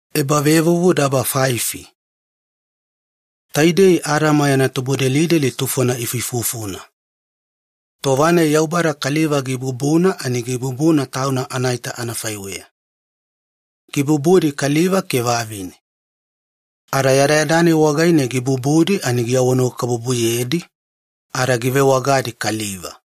Adama yana tubudelideli ifuifufudi. Taidei Adama yana tubudelideli tufona ifuifufuna. Tova-nai Yaubada kaliva gibubuna ani gibubuna tauna anaita anafaiweya. Gibubudi kaliva ke vavine. Ada yadayada-nai wagaine givonanuwakabubuyedi ada givewagadi kaliva.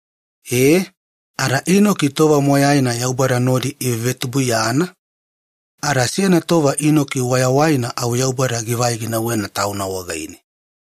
E, ada Inoki tova moyaina Yaubada nodi ivevetubuiyana, ada seyana tova Inoki wayawaina au Yaubada givai ginauwena Tauna wagaine.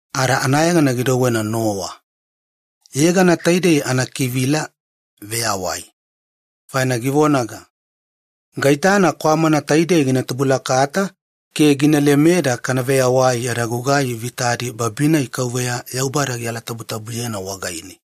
ada anayegana gidouwena Nowa. Yegana taidei anakivila ‘veyawai’, faina givonaga, “Gaitana kwamana taidei gina tubulakata ke gina lemeda kana veyawai yada gugai vitadi babi-nai Yaubada gialatabutabuyena wagaine.”